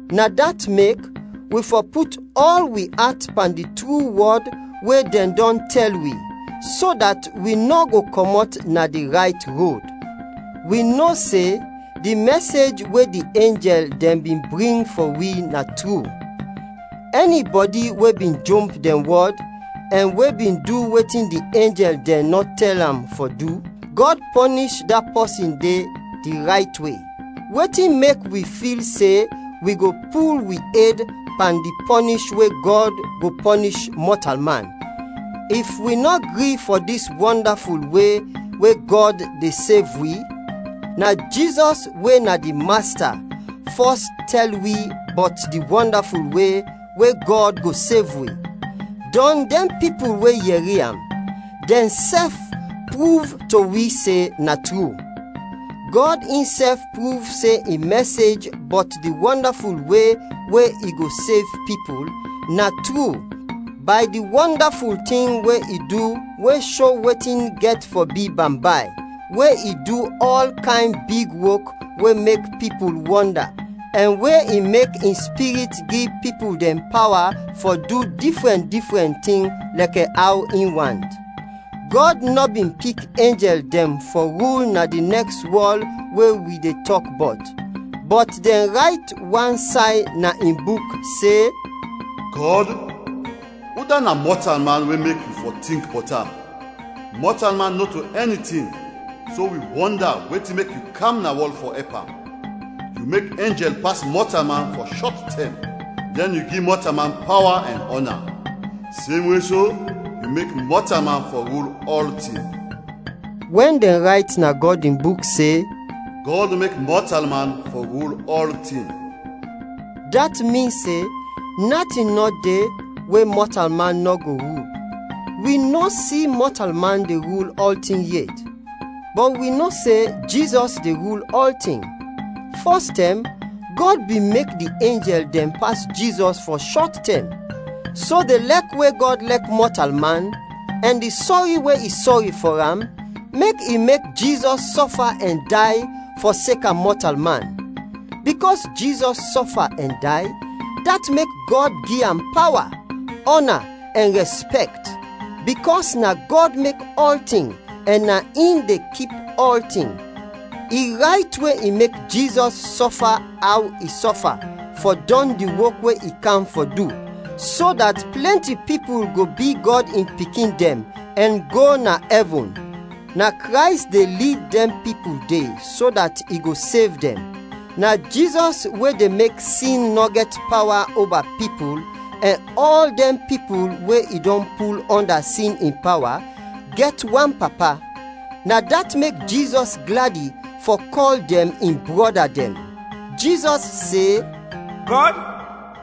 Na dat mek, wi fɔ put ɔl wi at pan di tru wɔd we dɛn dɔn tɛl wi, so dat wi nɔ go kɔmɔt na di rayt rod. Wi no se, di mɛsej we di enjɛl dɛn bin bring fɔ wi na tru. Ɛnibɔdi we bin jomp dɛn wɔd, ɛn we bin du wetin di enjɛl dɛn nɔ tɛl am fɔ du, Gɔd pɔnish da pɔsin de di rayt we. Wetin mek wi fil se, wi go pul wi ed pan di pɔnish we Gɔd go pɔnish mɔtalman, if wi nɔ gri fɔ dis wɔndaful we we Gɔd de sev wi? Na Jizɔs we na di Masta, fɔs tɛl wi bɔt di wɔndaful we we Gɔd go sev wi, dɔn dɛn pipul we yɛri am, dɛnsɛf pruv to wi se na tru. Gɔd insɛf pruv se in mɛsej bɔt di wɔndaful we we i go sev pipul, na tru, bay di wɔndaful tin we i du we sho wetin gɛt fɔ bi bambay; we i du ɔl kayn big wok we mek pipul wɔnda; ɛn we i mek in Spirit gi pipul dɛn pawa fɔ du difrɛn difrɛn tin lɛkɛ aw in want. Gɔd nɔ bin pik enjɛl dɛn fɔ rul na di nɛks wɔl, we wi de tɔk bɔt. Bɔt dɛn rayt wan say na in Buk se, “Gɔd, udat na mɔtalman we mek yu fɔ tink bɔt am? Mɔtalman nɔto ɛnitin, so wi wɔnda wetin mek yu kam na wɔl fɔ ɛp am? Yu mek enjɛl pas mɔtalman fɔ shɔt tɛm, dɛn yu gi mɔtalman pawa ɛn ɔna. Semwe so, yu mek mɔtalman fɔ rul ɔltin.” Wɛn dɛn rayt na Gɔd in Buk se “Gɔd mek mɔtalman fɔ rul ɔltin,” dat min se, natin nɔ de we mɔtalman nɔ go rul. Wi nɔ si we mɔtalman de rul ɔltin yet. Bɔt wi no se Jizɔs de rul ɔltin. Fɔstɛm, Gɔd bin mek di enjɛl dɛn pas Jizɔs fɔ shɔt tɛm, so di lɛk we Gɔd lɛk mɔtalman ɛn di sɔri we i sɔri fɔ am, mek i mek Jizɔs sɔfa ɛn day fɔseka mɔtalman. Bikɔs Jizɔs sɔfa ɛn day, dat mek Gɔd gi am pawa, ɔna ɛn rɛspɛkt. Bikɔs na Gɔd mek ɔltin ɛn na in de kip ɔltin, i rayt we i mek Jizɔs sɔfa aw i sɔfa fɔ dɔn di wok we i kam fɔ du, so dat plɛnti pipul go bi Gɔd in pikin dɛn, ɛn go na ɛvin. Na Krays de lid dɛn pipul de so dat i go sev dɛn. Na Jizɔs we de mek sin nɔ gɛt pawa oba pipul, ɛn ɔl dɛn pipul we i dɔn pul ɔnda sin in pawa, gɛt wan Papa. Na dat mek Jizɔs gladi fɔ kɔl dɛn in brɔda dɛn. Jizɔs se, “Gɔd,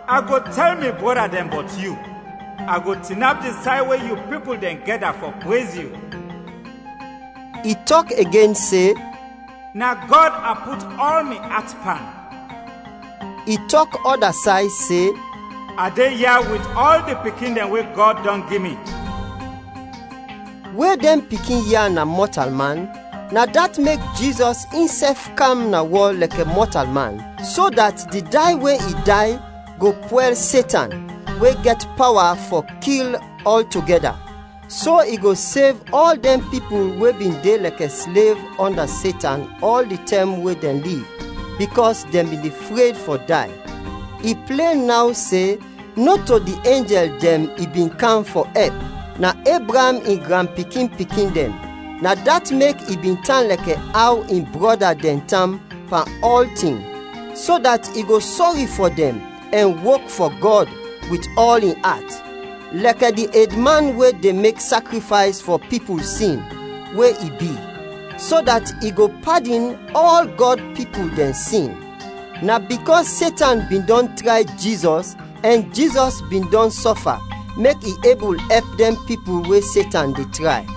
a go tɛl mi brɔda dɛn bɔt yu; a go tinap di say we yu pipul dɛn gɛda fɔ prez yu.” I tɔk igen se, “Na Gɔd a put ɔl mi at pan.” I tɔk ɔda say se, “A de ya wit ɔl di pikin dɛn we Gɔd dɔn gi mi.” We dɛn pikin ya na mɔtalman, na dat mek Jizɔs insɛf kam na wɔl lɛkɛ mɔtalman, so dat di day we i day go pwɛl Setan, we gɛt pawa fɔ kil, ɔltogɛda. So, i go sev ɔl dɛn pipul we bin de lɛkɛ slev ɔnda Setan ɔl di tɛm we dɛn liv, bikɔs dɛn bin de fred fɔ day. I plen naw se, nɔto di enjɛl dɛn i bin kam fɔ ɛp, na Ebraam in granpikin-pikin dɛn. Na dat mek, i bin tan lɛkɛ aw in brɔda dɛn tan pan ɔltin, so dat i go sɔri fɔ dɛn ɛn wok fɔ Gɔd wit ɔl in at, lɛkɛ di edman we de mek sakrifays fɔ pipul sin, we i bi, so dat i go padin ɔl Gɔd in pipul dɛn sin. Na bikɔs Setan bin dɔn tray Jizɔs ɛn Jizɔs bin dɔn sɔfa, mek i ebul ɛp dɛn pipul we Setan de tray.